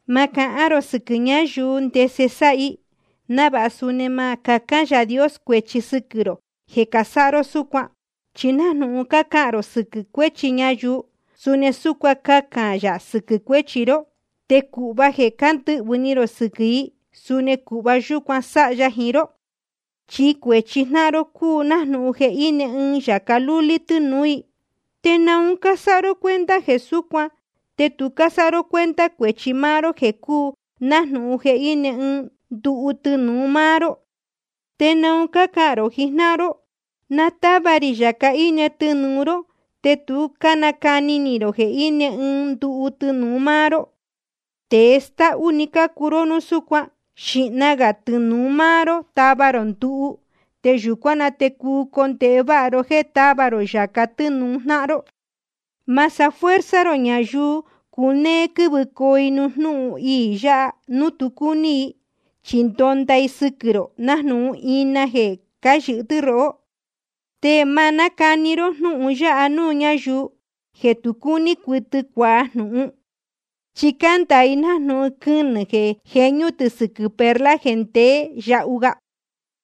’Ma cahán rō sɨquɨ̄ ñayuu ndese sáha i, návāha suni ma cahán Yaā Dios cuēchi sɨquɨ̄ maá ró jeē casáha ró súcuan. Chi nájnūhun cácahān rō sɨquɨ̄ cuéchi ñayuu, suni súcuan cahān yā sɨquɨ̄ cuéchi ró. Te cūhva jeē cándɨhvɨ̄ ni rō sɨquɨ̄ i, suni cūhva yúcuan sáha ya jiín ró. Chi cuēchi jnáhan ró cúu nájnūhun jeē íne ɨɨn yāca lúlí tɨnūú i. ¿Te naun cásáha ró cuenta jeē súcuan, te tu cásáha ró cuenta cuēchi máá ró jeē cúu nájnūhun jeē íne ɨɨn nduhu tɨnūu máá ró? ¿Te naun cácahān rō jiín jnáhan ró: Na táva rī yāca íne tɨnūu ró, te tu cánacani ni rō jeē íne ɨɨn nduhu tɨnūu máá ró? Tēe stáhú‑ni cácuu ró núu súcuan. Xīhna gā tɨnūu máá ró tava rō nduhu, te yūcuán na te cuu condēhe váha ró jéē táva rō yāca tɨ́nūu jnáhan ró. ’Ma sáha fuerza rō ñayuu cunéé quɨ́vɨcoo i nuū jnúhun iī yā núu tu cúní i. Chi ndonda i sɨquɨ̄ rō nájnūhun ina jeē cáyɨ̄hɨ tɨ́ rohó. Te ma nácani ró jnúhun ya nuū ñáyuu jeē tu cúní cuɨtɨ cuajnúhún. Chi cándāa i nájnūhun quɨnɨ̄ jeē jeñú tɨ̄ sɨquɨ̄ perla jeē ndeé yahu ga.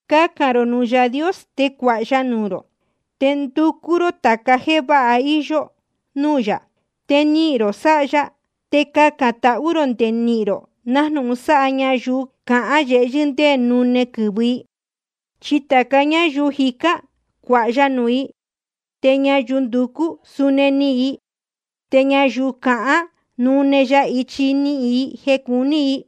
’Cacān rō nuū Yaā Dios, te cuāha ya nuū rō. Te nducú ró tāca jéē váha íyó núū yā, te nihīn rō sáha ya. Te cacān tahú rō nde nihīn rō, nájnūhun sáha ñayuu cahán yehyɨ́ ndé nune quɨ̄vɨ i. Chi tāca ñáyuu jicán, cuāha ya nuū i. Te ñayuu nducú, suni nihīn i. Te ñayuu cahán, nune ya ichi nihīn i jeē cuní i.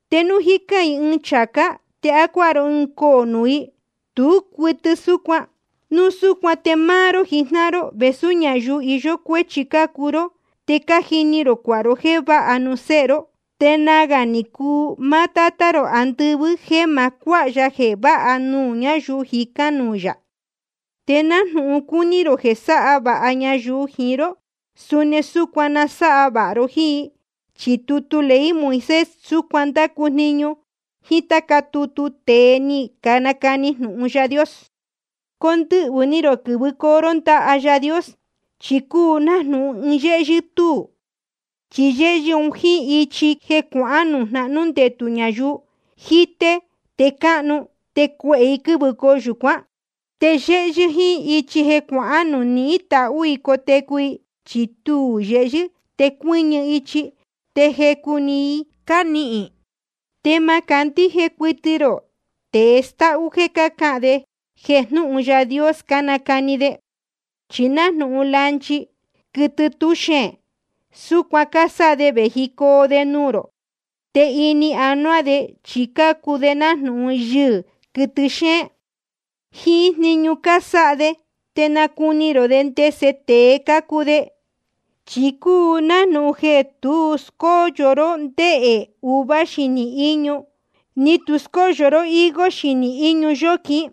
¿Te núu jícán i ɨɨn chācá, te á cuáha ró ɨɨn coō nuū i? Tú cuɨtɨ súcuan. Núu súcuan te máá ró jijnáhan ró, vēsú ñayuu iyó cuéchi cácuu ró, te cájini rō cuāha ró jéē váha nuū séhe ró. Te nagā ni cuu máá Tátá rō andɨvɨ́ jéē ma cuáha ya jeē váha nuū ñáyuu jicán nuū yā. ’Te nájnūhun cúní rō jeē sáha vāha ñayuu jiín ró, suni súcuan na sáha vāha ró jíín i. Chi tutu ley Moisés súcuan ndácu jniñu, jíín táca tutu tēe ni canacani jnūhun Yaā Dios. ’Condɨhvɨ̄ ni rō quɨ̄vɨcoo ró ndaha Yaā Dios. Chi cúu nájnūhun ɨɨn yéhyɨ́ túū. Chi yéhyɨ́ jíín ichi jeē cuahán nuū jnahnú ndetū ñayuu, jíté te cáhnu, te cuehē i quɨ́vɨcoo yūcuán. Te yéhyɨ́ jíín ichi jeē cuahán nuū nihín tahú i cotecu i, chi tuū yehyɨ́ te cuɨ́ñɨ ichi, te jecu‑ni i cánihīn i. ’Te ma cándíje cuɨtɨ rō tēe stáhú jéē cácahān de jeē jnúhun Yaā Dios cánacani de. Chi nájnūhun lanchi, quɨtɨ tú xeēn, súcuan cásáha de vējicoo de nuū rō. Te ini anuá de chi cácuu de nájnūhun yɨhɨ̄, quɨtɨ xéén. Jíín jniñu cásáha de te nacuni rō de ndese tēe cácuu de. Chi cúu nájnūhun jeē tu scóyo ró ndehē uva xinī íñu, ni tu scóyo ró higo xinī iñu yóquin.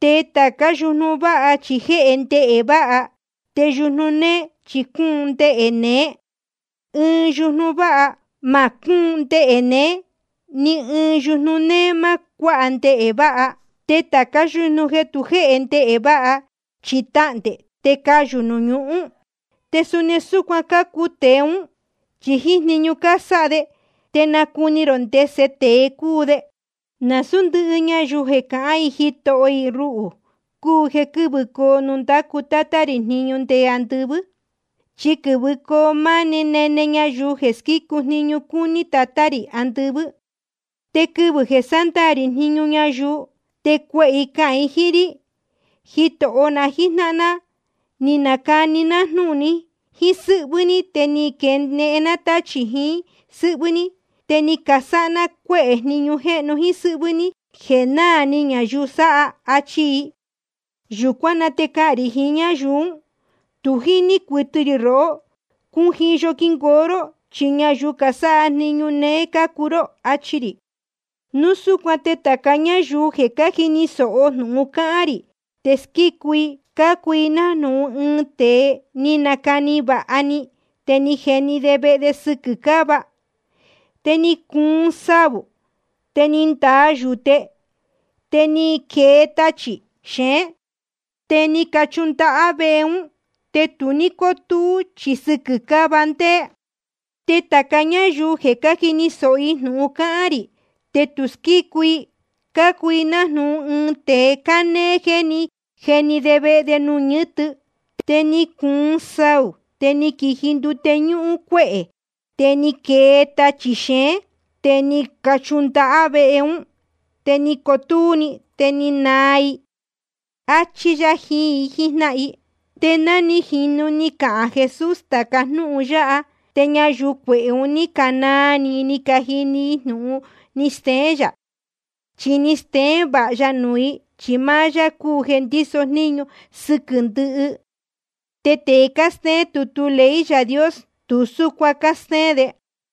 Te tācá yujnu váha chi jéhe ndehē váha, te yujnu néé chi cúun ndehē neé. Ɨɨn yujnu váha ma cúun ndehē neé, te ni ɨɨn yujnu néé ma cuáha ndehē váha. Te tācá yujnu jeē tu jēhe ndehē váha, chi tahndē te cayū nuū ñuhún. Te suni súcuan cácuu tēe ún, chi jíín jniñu cásáha de te nácuni rō ndese tēe cácuu de. ’Nasūú ndɨhɨ ñayuu jeē cahán i Jitoho i ruhū cúu jeē quɨ̄vɨcoo nuū ndácu Tátá rī jniñu nde andɨvɨ́. Chi quɨ̄vɨcoo máá nene ñayuu jeē squícu jniñu cúní Tatá rī andɨvɨ́. Te quɨvɨ̄ jeē sándaā rī jniñu ñayuu, te cuehē i cahān jiín rí: Jitoho na jíjnáhan ná, ni canacani ná jnúhun jíín sɨ́hvɨ́ ní, te ni caquenehen ná táchī jiín sɨ́hvɨ́ ní, te ni casáha ná cuéhē jniñu jéhnu jíín sɨ́hvɨ́ ní jeē náā ni ñayuu sáha. Achi i. Yūcuán na te cahān rī jiín ñáyuu ún: Tu jíní cuɨtɨ rī rohó. Cujiyo quingoo ró, chi ñayuu casáha jniñu néé cácuu ró, achi rī. ’Núu súcuan te tāca ñáyuu jeē cájini sōho jnūhun cáhán rī te squícu i, cácuu i nájnūhun ɨɨn tēe ni nacani vāha ni, te ni jeni de vehe de sɨquɨ̄ cáva. Te ni cuun saū, te ni ndaa yūte, te ni quee tachī xeén, te ni cachundahá vehe ún. Te tu ní cótúú, chi sɨquɨ̄ cáva ndéé. Te tāca ñáyuu jeē cájini sōho jnūhun cáhán rī te tu squícu i, cácuu i nájnūhun ɨɨn tēe cánéé jeē ní jeni de vehe de nuū ñɨ́tɨ. Te ni cuun saū, te ni quiji ndute ñúhún cuéhē, te ni quee tachī xeén, te ni cachundahá vehe ún. Te ni cotúú‑ni, te ni naa iī‑ni. Achí yá jiín i jíjnáhan i. Te ná ni jīnu ni cahān Jesús tāca jnúhun yáha, te ñayuu cuehē un ní canaa ni i ni cajini i jnūhun ni steén yā. Chi ni steén vāha ya nuū i, chi máá yá cúu jeē ndíso jníñu sɨquɨ̄ ndɨhɨ. Te tēe cástéén tutu ley Yaā Dios, tu súcuan cástéén de.